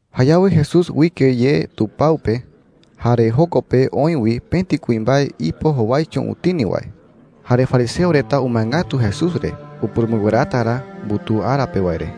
Jayawe Jesús uike ye tupao pe, jare joko pe oï wi pëti kuimbae ipo jowaicho utini wae. Jare fariseo reta umae ngatu Jesús re upurumɨnguerata ra mbutuu ara pe wae re.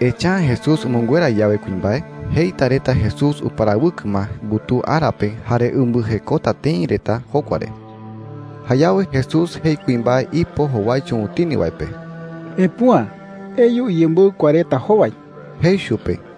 Echa’ä Jesús umɨnguera yawe kuimbae, jeita reta Jesús uparawɨkɨ ma mbutuu ara pe jare umbɨjekota tëi reta jokua re. Jayawe Jesús jei kuimbae ipo jowaicho utini wae pe: “Epüa. Eyu iyemboɨ kua reta jowai,” jei chupe.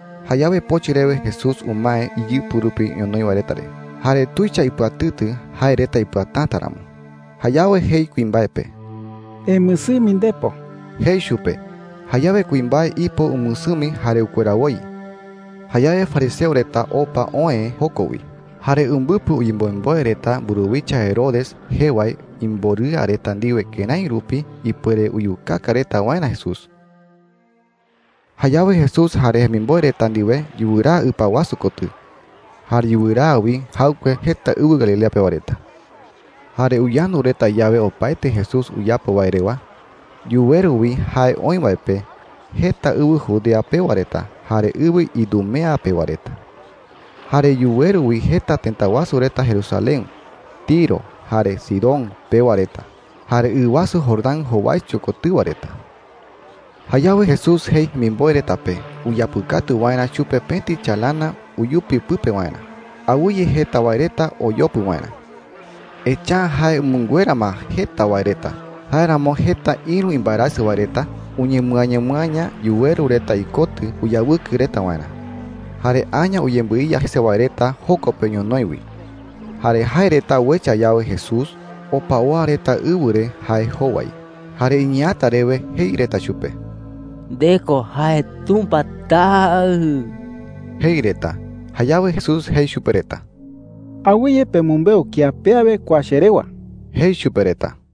Jayawe pochɨ rewe Jesús umae iyɨpɨ rupi ñonoï wae reta re, jare tuicha ipɨatɨtɨ jae reta ipɨatäta ramo. Jayawe jei kuimbae pe: “Emɨsɨmi ndepo,” jei chupe. Jayawe kuimbae ipo umɨsɨmi jare ukuera woi. Jayawe fariseo reta opa oë joko wi. Jare umbɨpɨ uyemboemboe reta mburuwicha Herodes jee wae imborɨa reta ndiwe kërái rupi ipuere uyukaka reta waerä Jesús. Jayawe Jesús jare jemimboe reta ndiwe yuraa ɨpa wasu kotɨ. Jare yuraa wi jaɨkue jeta ɨwɨ Galilea pewa reta. Jare uyandu reta yawe opaete Jesús uyapo wae rewa, yuweru wi jae oï wae pe jeta ɨwɨ Judea pewa reta jare ɨwɨ Idumea pewa reta. Jare yuweru wi jeta tëta wasu reta Jerusalén, Tiro, jare Sidón pewa reta, jare ɨ wasu Jordán jowaicho kotɨwa reta. Jayawe Jesús jei jemimboe reta pe uyapɨkatu waerä chupe pëti chalana uyupi pɨpe waerä, awɨye jeta wae reta oyopɨ waerä. Echa’ä jae umɨnguera ma jeta wae reta; jáeramo jeta ïru imbaerasɨ wae reta uñemɨañamɨaña yuweru reta ikotɨ uyawɨkɨ reta waerä. Jare aña uyembɨiya jese wae reta joko pe ñonoï wi. Jare jae reta uecha yawe Jesús, opa oa reta ɨwɨ re jae jowai, jare iñeeäta rewe jei reta chupe: “Nde ko jae Tumpa Taɨ,” jei reta. Jayawe Jesús jei chupe reta: “Awɨye pemɨmbeu kía pe awe kua che rewa,” jei chupe reta.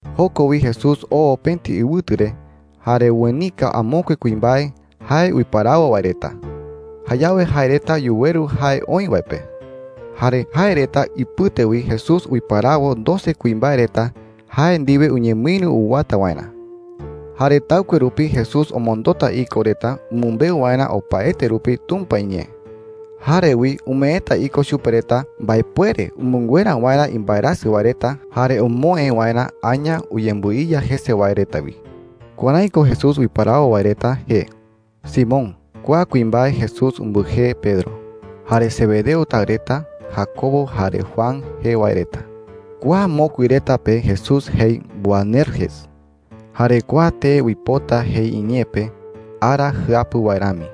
Joko wi Jesús oo pëti ɨwɨtu re, jare uenika amokue kuimbae jae uiparawo wae reta. Jayawe jae reta yuweru jae oï wae pe. Jare jae reta ipɨte wi Jesús uiparawo doce kuimbae reta jae ndiwe uñemɨïru uwata waerä. Jare taɨkue rupi Jesús omondota iko reta umɨmbeu waerä opaete rupi Tumpa iñee. Jare wi umeeta iko chupe reta mbaepuere umɨnguera waerä imbaerasɨ wae reta jare omoë waerä aña uyembɨiya jese wae reta wi. Kuärái ko Jesús uiparawo wae reta jee: Simón (kua kuimbae Jesús umbɨjee Pedro); jare Zebedeo taɨ reta Jacobo jare Juan jee wae reta (kua mokui reta pe Jesús jei Boanerges, jare kua tee uipota jei iñee pe, “Ara jɨapu wae rami.”).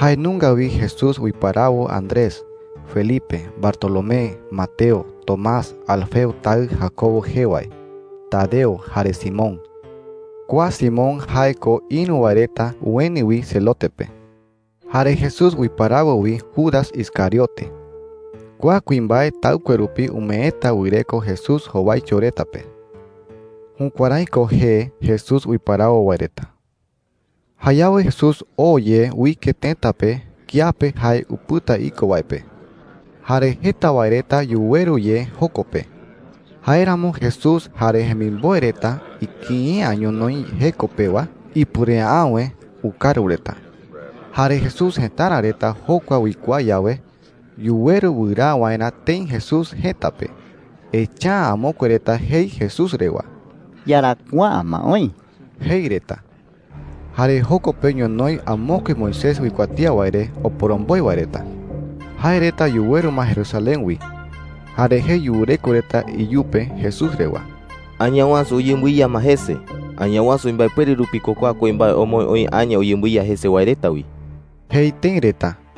Jae nunga wi Jesús uiparawo Andrés, Felipe, Bartolomé, Mateo, Tomás, Alfeo taɨ Jacobo jee wae, Tadeo, jare Simón (kua Simón jae ko ïru wae reta ueni wi Zelote pe). Jare Jesús uiparawo wi Judas Iscariote (kua kuimbae taɨkue rupi umeeta wɨreko Jesús jowaicho reta pe). Jukuärái ko jee Jesús uiparawo wae reta. Jayawe Jesús oo ye uike tëta pe kiape jae upɨta iko wae pe. Jare jeta wae reta yuweru ye joko pe. Jáeramo Jesús jare jemimboe reta ikïi’ä ñonoï jeko pewa, ipuere’äwe ukaru reta. Jare Jesús jëtara reta jokua uikuaa yawe, yuweru wɨraa waerä tëi Jesús jëta pe. Echa’ä amokue reta jei Jesús rewa: “Iyarakuaa’ä ma oï,” jei reta. Jare joko pe ñonoï amokue Moisés uikuatía wae re oporomboe wae reta. Jae reta yuweru ma Jerusalén wi. Jare jei yureko reta iyupe Jesús rewa: “Añawasu Jae ko “Beelzebú jae reta iñee pe. uyembɨiya ma jese. Añawasu imbaepuere rupi ko kua kuimbae omoë oï aña uyembɨiya jese wae reta wi,” jei tëi reta.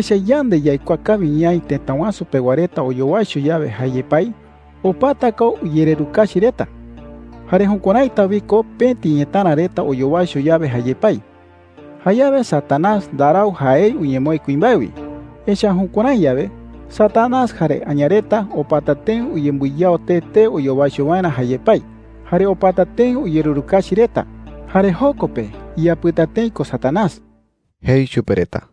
“Echa’ä yande yaikuaa kawi ñaï tëta wasu pewa reta oyowaicho yawe jae yepái, opata ko uyererukachi reta. Jare jukuäraita wi ko pëti ñetära reta oyowaicho yawe jae yepái,” jei. “Jayawe Satanás ndarau jaei uñemoë kuimbae wi. Echa’ä jukuärái yawe, Satanás jare aña reta opata tëi uyembɨyao tee tee oyowaicho waerä jae yepái, jare opata tëi uyererukachi reta. Jare joko pe iyapɨta tëi ko Satanás,” jei chupe reta.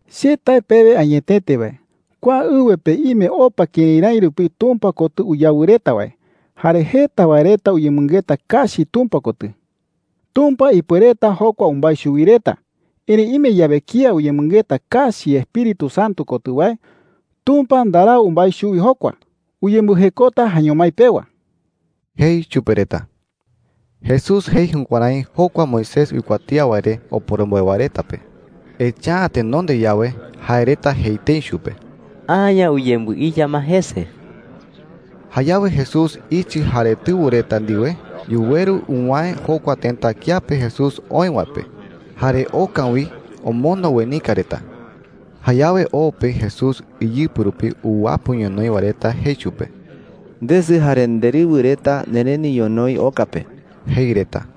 “Che tae pewe añetete wae, kua ɨwɨ pe ime opa kërái rái rupi Tumpa kotɨ uyawɨ reta wae, jare jeta wae reta uyemɨngeta kachi Tumpa kotɨ,” jei. “Tumpa ipuereta jokua umbái chuwi reta. Erëi ime yawe kía uyemɨngeta kachi Espíritu Santo kotɨ wae, Tumpa ndarau umbái chuwi jokua. Uyembɨjekota jaeño mái pewa,” jei chupe reta. Jesús jei jukuärái jokua Moisés uikuatía wae re oporomboe wae reta pe, echa’ä tenonde yawe jae reta jei tëi chupe: “Aña uyembɨiya ma jese.” Jayawe Jesús ichɨ jare tɨwɨ reta ndiwe yuweru uwäe jokua tëta kiape Jesús oï wae pe, jare oka wi omondo uenika reta. Jayawe o pe Jesús iyɨpɨ rupi uwapɨ ñonoï wae reta jei chupe: “Ndesɨ jare nderɨwɨ reta nereni ñonoï oka pe,” jei reta.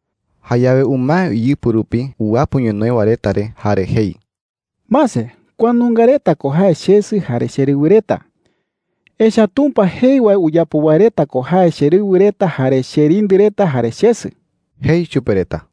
Jayawe umae iyɨpɨ rupi uwapɨ ñonoï wae reta re jare jei: “Mase, kua nunga reta ko jae chesɨ jare cherɨwɨ reta. Echa’ä Tumpa jei wae uyapo wae reta ko jae cherɨwɨ reta jare cherindɨ reta jare chesɨ,” jei chupe reta.